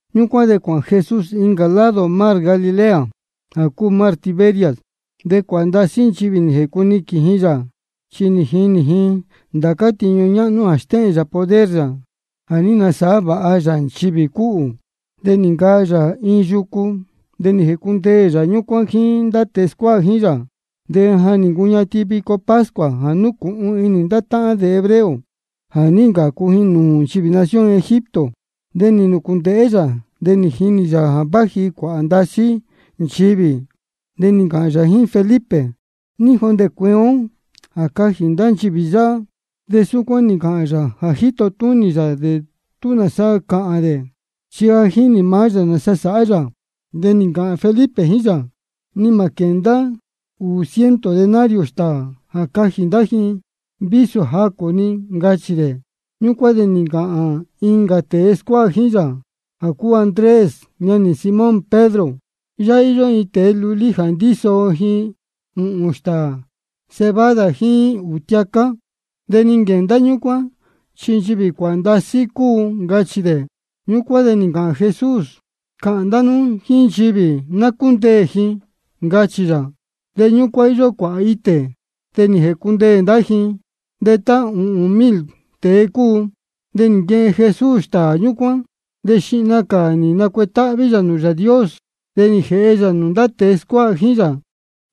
Ñúcuán de cuāhān Jesús incā lado mar Galilea, jā cúu mar Tiberias. De cuāhā ndasí nchivī nī jēcuniquīn ji yā, chi nī jinī ji ndācá tiñu ñáhnú jā stéhēn yā poder yā jā ní nasāhá vāha yā nchivī cúhū. De nī ncaa yā iin yucu, de nī jēcundeē yā ñúcuán jíín ndá tēe scuáha jíín yā. De ja nī ncuñatin vico pascua jā núcūhun inī ndá táhán yā hebreo jā ní ncācu ji nūū nchivī nación Egipto. De nī nūcūndēhé yā, de nī jinī yā jā váji cuāhā ndasí nchivī. De nī ncāhān yā jíín Felipe: ¿Ní jondē cueen ó jā cajī ndá nchivī yáhá? De súcuán nī ncāhān yā jā jíto túnī yā dē tú nāsa cāhān dē. Chi ja jínī maá yā nāsa sāhá yā. De nī ncāhān Felipe jíín yā: Ni mā quēndá ūū ciento denario stāā jā cajī ndá ji vísō jacū-ni, ncachī dē. Ñúcuán de nī ncāhān incā tēe scuáha jíín yā, jā cúu Andrés, ñanī Simón Pedro: Yáhá íyó iin tēe lulí jā ndíso ji ūhūn stāā cebada jíín ūū tiacá. ¿De ní quenda ñúcuán, chi nchivī cuāhā ndasí cúu? ncachī dē. Ñúcuán de nī ncāhān Jesús: Cāhān ndá nú jíín nchivī ná cúndeē ji, ncachī yā. De ñúcuán íyó cuāhā itē, de nī jēcundeē ndá ji, de tá ūhūn mil tēe cúu. De nī nquehen Jesús stāā ñúcuán, de xihna cā nī nacuetáhví yā nūū Yāā Dios. De nī jēhe yā nūū ndá tēe scuáha jíín yā,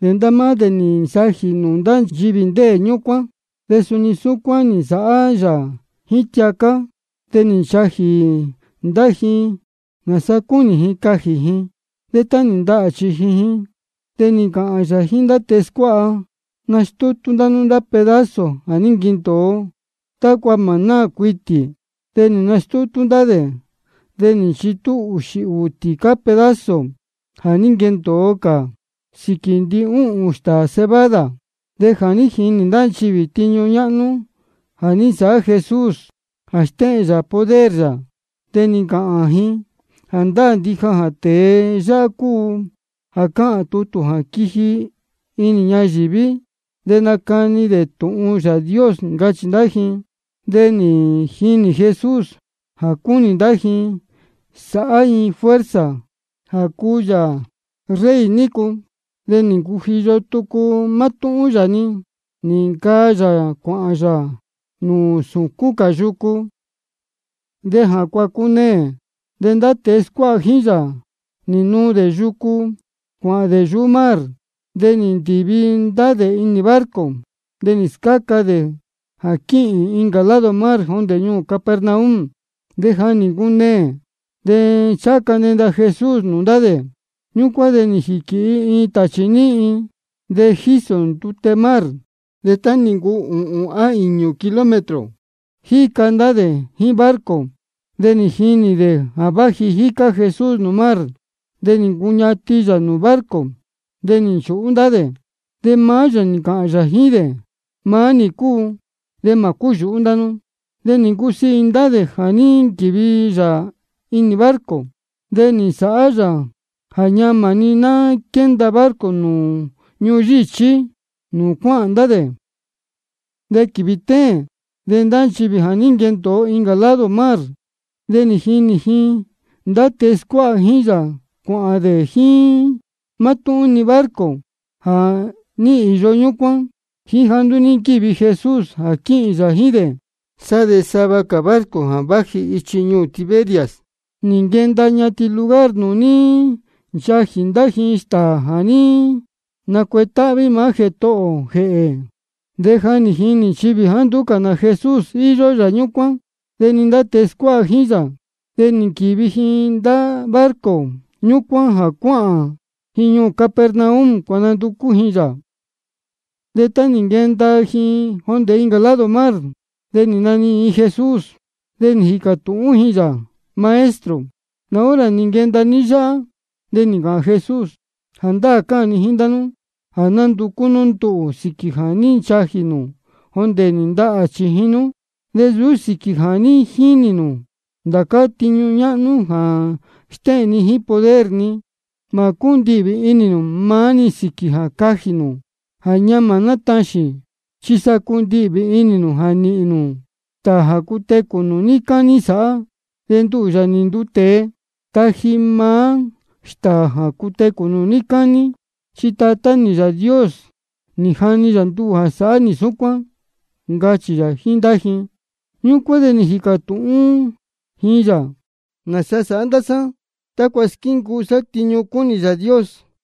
de ndá máá dē nī nsajī dē nūū ndá nchivī ndéē ñúcuán. De suni súcuán nī nsāhá yā jíín tiacá, de nī nchajī ndá ji nāsaa cúnī ji cajī ji. De tá nī ndahā chījin ji, de nī ncāhān yā jíín ndá tēe scuáha: Nastútú ndá nú ndá pedazo jā ní nquendōo, tácua mā náā cuitī. De nī nastútú ndá dē, de nī nchitú ūxī ūū tīcá pedazo jā ní nquendōo cā sīquī ndihúhūn stāā cebada. De jā ní jinī ndá nchivī tiñu ñáhnú jā ní nsāhá Jesús jā stéhēn yā poder yā, de nī ncāhān ji: Jāndáā ndija jā tēe yáhá cúu jā cáhān tutū jā quiji inī ñayīví jā nacani tūhun Yāā Dios, ncachī ndá ji. De nī jinī Jesús jā cúnī ndá ji sāhá ji fuerza jā cuu yā rey ji nícu. De nī ncujiyo tucu mátúhún yā-ni, nī ncaa yā cuāhān yā nūū sūcún cā yucu. De jā cuácuneē, de ndá tēe scuáha jíín yā nī nuu dē yucu cuāhān dē nūū mar. De nī ndīvi ndá dē inī barco, de nī scáca dē jā quīhīn dē incā lado mar jondē ñuū Capernaum. De ja nī ncuneē, de ncháha ca nenda Jesús nūū ndá dē. Ñúcuán de nī jīquīhi iin tāchī níhin, de jísō ndute mar sáhá. De tá nī ncuu tá cúu ūhūn á īñū kilómetro jíca ndá dē jíín barco, de nī jinī dē jā jíca Jesús nūū mar, de nī ncuñatin yā nūū barco. De nī nchūhú ndá dē. De maá yā nī ncāhān yā jíín dē: Maá nī cúu, de mā cúyūhú ndá nú. De nī ncusiī inī ndá dē jā ná quívi yā inī barco. De nī nsāhá yā jā ñamā-ni nī nquenda barco nūū ñuhun yíchí nūū cuáhān ndá dē. De quīvī téēn de ndá nchivī jā ní nquendōo incā lado mar, nī jinī ji jā ndá tēe scuáha jíín yā cuāhān dē jíín mátúhún-ni barco jā ní īyo ñúcuán, jíín jāá nduú ní nquívi Jesús jā quīhīn yā jíín dē. Sá de sava cā barco jā váji ichi ñuū Tiberias, nī nquenda ñatin lugar nūū ní nchajī ndá ji stāā jā ní nacuetáhví maá Jētohō ō jēhē. De jā ní jinī nchivī jāá nduú cā Jesús íyó yā ñúcuán, de ni ndá tēe scuáha jíín yā, de nī nquīvi ji ndá barco ñúcuán, de cuāhān ji ñuū Capernaum cuānanducú ji yā. De tá nī nquenda ji jondē incā lado mar, de nī nanihīn ji Jesús. De nī jīcā tūhún ji yā: Maestro, ¿nā hora nī nquenda ní yáhá? De nī ncāhān Jesús: Jāndáā cáhān ni jíín ndá nú jā nánducú nú nduhū sīquī jā ní nchajī nū jondē nī ndahā chījin nú, de nsūú sīquī jā ní jinī nū ndācá tiñu ñáhnú jā ní stéhēn ni poder ni. Mā cúndihvī inī nū maá-ni sīquī jā cajī nū jā ñamā nataxīn, chi sa cundihvī inī nū jā nīhīn nū stāā jā cutecū nū níí cání sāhá. De nduhū, Yāā nī nduu tēe, taji nī maá stāā jā cutecū nū níí cání. Chi Tatá nī Yāā Dios nī jani yā nduhū jā sáhá nī súcuán, ncachī yā jíín ndá ji. Ñúcuán de nī jīcā tūhún ji yā: ¿Nāsa sāhá ndá sá tácua squíncuu sá tiñu cúnī Yāā Dios?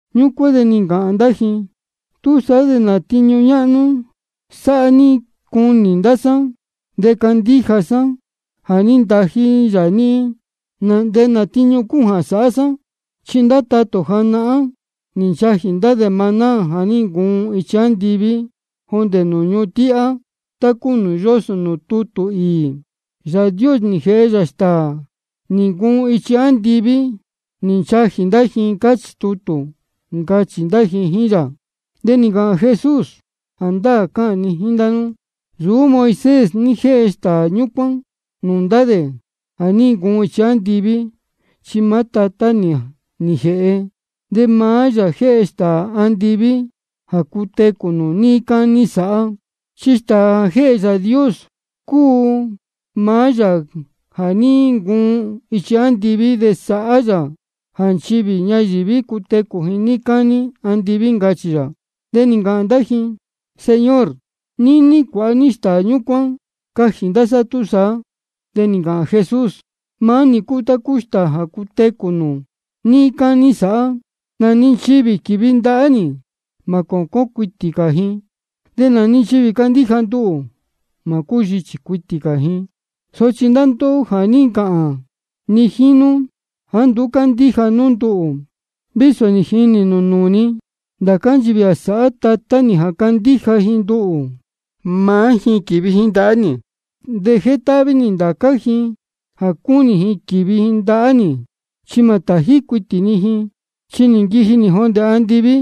Ñúcuán de nī ncāhān ndá ji: ¿Túsaá de nā tiñu ñáhnú sāhá ní cunī ndá sá de candíja sá jā ní ntají yā níhín? ¿Nā tiñu cúu jā sáhá ní? Chi ndá tatā ō janahán nī nchajī dē maná jā ní ncuun ichi andiví jondē nūū ñuhun tíhá, tá cúu nūū yósō nūū tutū īī: Yāā Dios nī jēhe yā stāā nī ncuun ichi andiví nī nchajī ndá ji, cáchī tutū, ncachī ndá ji jíín yā. De nī ncāhān Jesús: Jāndáā cáhān ni jíín ndá nú: Nsūú Moisés ní jéhe stāā ñúcuán nūū ndá dē jā ní ncuun ichi andiví, chi maá Tatá nī nī jēhe. De maá yā jéhe stāā andiví jā cutecū nū níí cání sāhá. Chi stāā jā jéhe Yāā Dios cúu maá Yāā jā ní ncuun ichi andiví, de sáhá yā jā nchivī ñayīví cutecū ji níí cání andiví, ncachī yā. De nī ncāhān ndá ji: Señor, níní cuāha ní stāā ñúcuán cajī ndá sá túsaá. De nī ncāhān Jesús: Maá nī cúu maá stāā jā cutecū nū níí cání sāhá. Nā-ni nchivī quívi ndahá nī, mā cōcón cuitī cā ji. De nā-ni nchivī cándíja nduhū, mā yíchī cuitī cā ji. Sochi ndá ndóhó ja nī ncāhān ni jíín nú jāá nduú cándíja nú nduhū, vísō nī jinī nū nūū ni. Ndācá nchivī jā sáhá Tatá nī jā candíja ji nduhū, maá ji quívi ndahá nī. De jétáhví nī ndācá ji jā cúnī ji quīvi ji ndahá nī, chi mā tají cuitī ni ji. Chi nī nquiji nī jondē andiví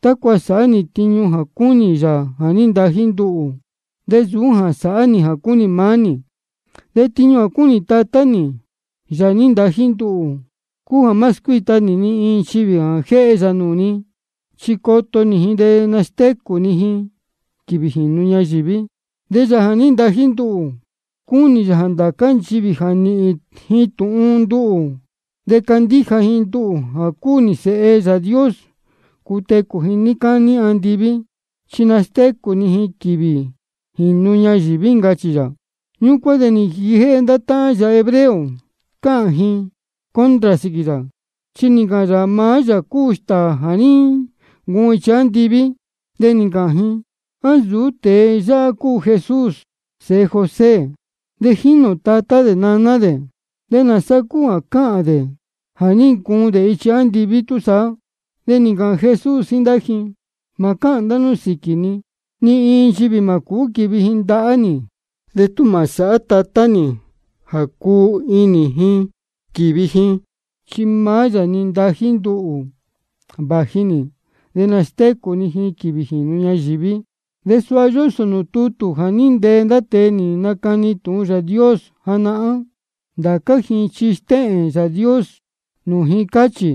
tácua sāhá nī tiñu jā cúnī Yāā jā ní ntají nduhū, de nsūú jā sāhá nī jā cúnī maá nī. De tiñu jā cúnī Tatá nī, Yāā nī ntají nduhū, cúu jā má scuíta nī ni iin nchivī jā jéhe yā nūū ni, chi coto nī ji de nastécū ni ji quīvī jīnu ñayīví. De Yāā nī ntají nduhū, cúnī yā jā ndācá nchivī jā níhīn ji tūhun nduhū de candíja ji nduhū jā cúu nī Sēhe Yāā Dios, cutecū ji níí cání andiví. Chi nastécū ni ji quīvī jīnu ñayīví, ncachī yā. Ñúcuán de nī nquijéhé ndá táhán yā hebreo cáhān ji contra sīquī yā, chi nī ncāhān yā jā maá yā cúu stāā jā ní ncuun ichi andiví. De nī ncāhān ji: ¿A nsūú tēe yáhá cúu Jesús sēhe José? De jínī ō tatá dē naná dē. ¿De nāsa cúu jā cáhān dē jā ní ncuun dē ichi andiví túsaá? De nī ncāhān Jesús jíín ndá ji: Mā cáhān ndá nú sīquī ni. Ni iin nchivī mā cūú quīvi ji ndahá nī de tú mā sāhá Tatá nī jā cuu inī ji quīvi ji, chi maá yā nī ntají nduhū vāji nī. De nastécū ni ji quīvī jīnu ñayīví. De suha yósō nūū tutū jā ní ntee ndá tēe nī nacani tūhun Yāā Dios janahán: Ndācá ji chi stéhēn Yāā Dios nūū ji, cáchī.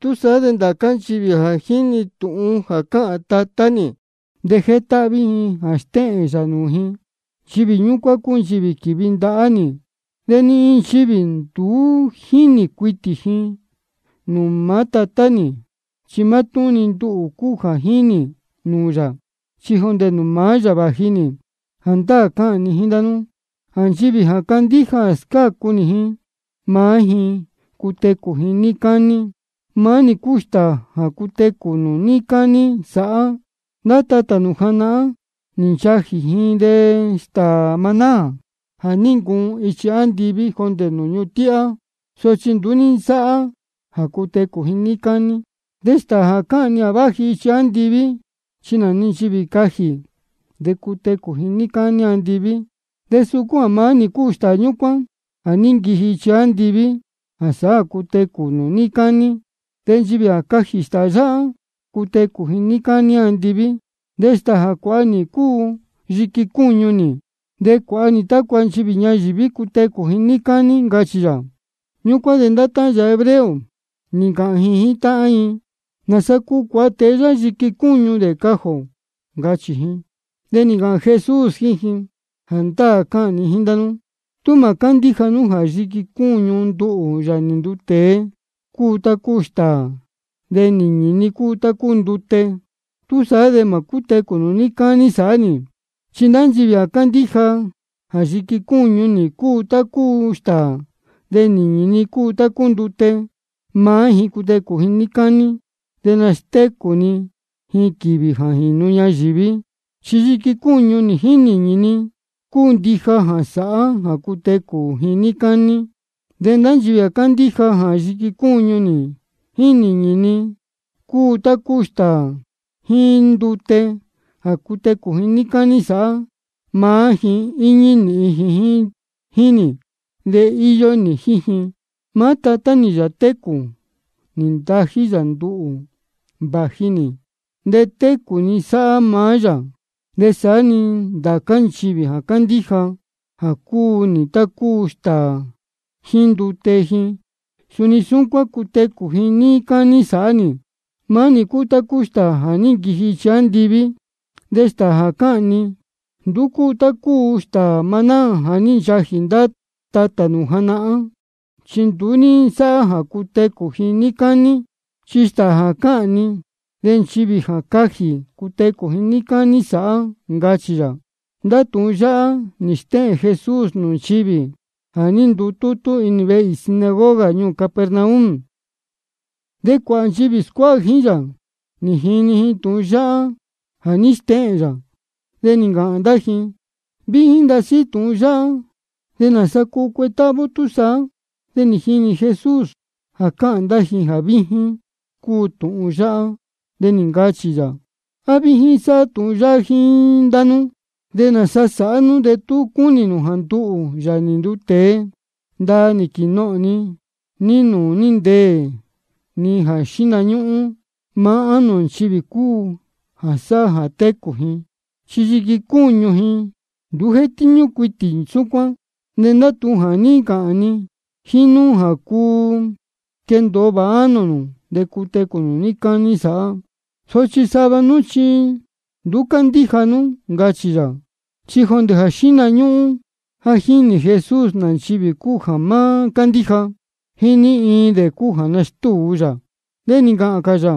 Túsaá de ndācá nchivī jā jíni tūhun jā cáhān Tatá nī de jétáhví ji jā stéhēn yā nūū ji, nchivī ñúcuán chi quīvi ji ndahá nī. Ni iin nchivī nduú ní jínī cuitī ji nūū maá Tatá nī. Chi mátúhún-ni nduhū cúu jā ní jinī nūū yā, chi jondē nūū maá yā vāji nī. Jāndáā cáhān ni jíín ndá nú jā nchivī jā candíja jā scácu nī ji, maá ji cutecū ji níí cání. Maá nī cúu stāā jā cutecū nū níí cání sāhá. Ndá tatā nū janahán, nī nchajī dē stāā maná jā ní ncuun ichi andiví jondē nūū ñuhun tíhá, sochi nduú ní nsáhá jā cutecū dē níí cání. De stāā jā cáhān ni jā váji ichi andiví, chi nā-ni nchivī cajī, de cutecū ji níí cání andiví. De suu maá nī cúu stāā ñúcuán jā ní nquiji ichi andiví jā sáhá jā cutecū nū níí cání. De nchivī jā cajī stāā yáhá, cutecū ji níí cání andiví. De stāā jā cuāha nī cúu yiqui cúñu nī, de cuāha nī tácua nchivī ñayīví cutecū ji níí cání, ncachī yā. Ñúcuán de ndá táhán yā hebreo nī ncāhān ji jíín táhán ji: ¿Nāsa cuu cuāha tēe yáhá yiqui cúñu dē cajī ō? ncachī ji. De nī ncāhān Jesús jíín ji: Jāndáā cáhān ni jíín ndá nú: Tú mā cándíja nú jā yiqui cúñu nduhū, Yāā nī nduu tēe, cúu tá cúu stāā, de nīñī ni cúu tá cúu ndute, túsaá de mā cútecū nū níí cání sāhá. Chi ndá nchivī jā candíja jā yiqui cúñu nī cúu tá cúu stāā de nīñī ni cúu tá cúu ndute, maá ji cutecū níí cání. De nastécū ni ji quīvī jā jīnu ñayīví. Chi yiqui cúñu nī jíín nīñī ni cúu ndija jā sāhá jā cutecū ji níí cání. De ndá nchivī jā candíja jā yiqui cúñu nī jíín nīñī ni cúu tá cúu stāā jíín ndute jā cutecū ji níí cání sāhá, maá ji íñí nīhin ji jíín nī, de íyó nī jíín ji. Maá Tatá nī, Yāā técū, nī ntají yā nduhū vāji nī, de técū ni sáhá maá yā. De saá-ni ndá nchivī jā candíja jā cúu nī tá cúu stāā ji jíín ndute ji, suni súcuán cutecū ji níí cání sāhá nī. Maá nī cúu stāā jā ní nquiji ichi andiví. De stāā jā cáhān ni nduú cúu tá cúu stāā maná jā ní nchajī ndá tatā nū janahán, chi nduú ní nsáhá jā cutecū ji níí cání. Chi stāā jā cáhān ni, de nchivī jā cajī, cutecū ji níí cání sāhá, ncachī yā. Ndá tūhun yáhá nī stéhēn Jesús nūū nchivī jā ní ndutútú inī vehe īī sinagoga ñuū Capernaum. De cuāhā nchivī scuáha jíín yā, nī jini ji tūhun yáhá jā ní stéhēn yā, de nī ncāhān ndá ji: Víjín ndasí tūhun yáhá. ¿Nāsa cuu cuetáhví ó túsaá? De nī jinī Jesús jā cáhān ndá ji jā víjín cúu tūhun yáhá, de nī ncāhān yā: ¿A víjín sáhá tūhun yáhá jíín ndá nú? ¿De nāsa sāhá nú de tú cunī nū jā nduhū, Yāā nī nduu tēe, ndaa nī quīnohōn ni nūū ní ndeē ni xihna ñúhún? Maá ánō nchivī cúu jā sáhá jā técū ji. Chi yiqui cúñu ji nduú jétíñú cuitī súcuán. De ndá tūhun jā ní ncāhān ni jíín nú cúu jā quendōo vāha ánō nū, de cutecū nū níí cání sāhá. Sochi sava nú chi nduú cándíja nú, ncachī yā. Chi jondē jā xíhna ñúhún ja jínī Jesús nā nchivī cúu jā má cándíja, jíín ní iin dē cúu jā nastúu dē yā. De nī ncāhān cā yā: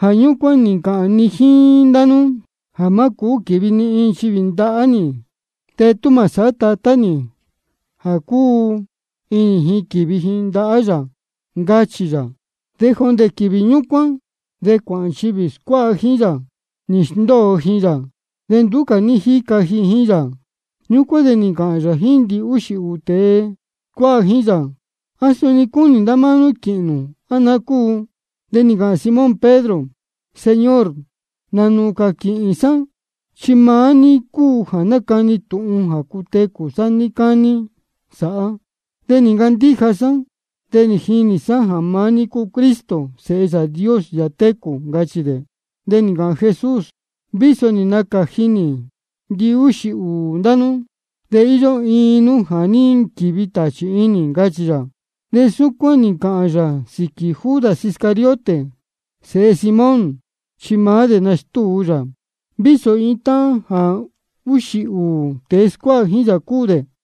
Jā ñúcuán nī ncāhān ni jíín ndá nú jā má cūú quīvi ni iin nchivī ndahá nī de tú mā sāhá Tatá nī jā cuu inī ji quīvi ji, ncachī yā. De jondē quīvī ñúcuán de cuāhā nchivī scuáha jíín yā, nī sndóo ji yā, de nduú cā ní jíca ji jíín yā. Ñúcuán de nī ncāhān yā jíín ndihúxī ūū tēe scuáha jíín yā: ¿A suni cúnī ndá máá nú quīhīn nū, á naá cúu? De nī ncāhān Simón Pedro: Señor, ¿nā nūū cā quīhīn sá? Chi maá ní cúu jā nácani tūhun jā cutecū sá níí cání sāhá. De nī ncandíja ndá sá de jínī sá jā maá ní cúu Cristo, Sēhe Yāā Dios, Yāā técū, ncachī dē. De nī ncāhān Jesús: De vísō nī nacāji nī ndihúxī ūū ndá nú, de íyó iin nú jā ní nquīvi tāchī inī, ncachī yā. De súcuán nī ncāhān yā sīquī Judas Iscariote, sēhe Simón. Chi maá dē nastúu dē yā, vísō iin táhán jā úxī ūū tēe scuáha jíín yā cúu dē.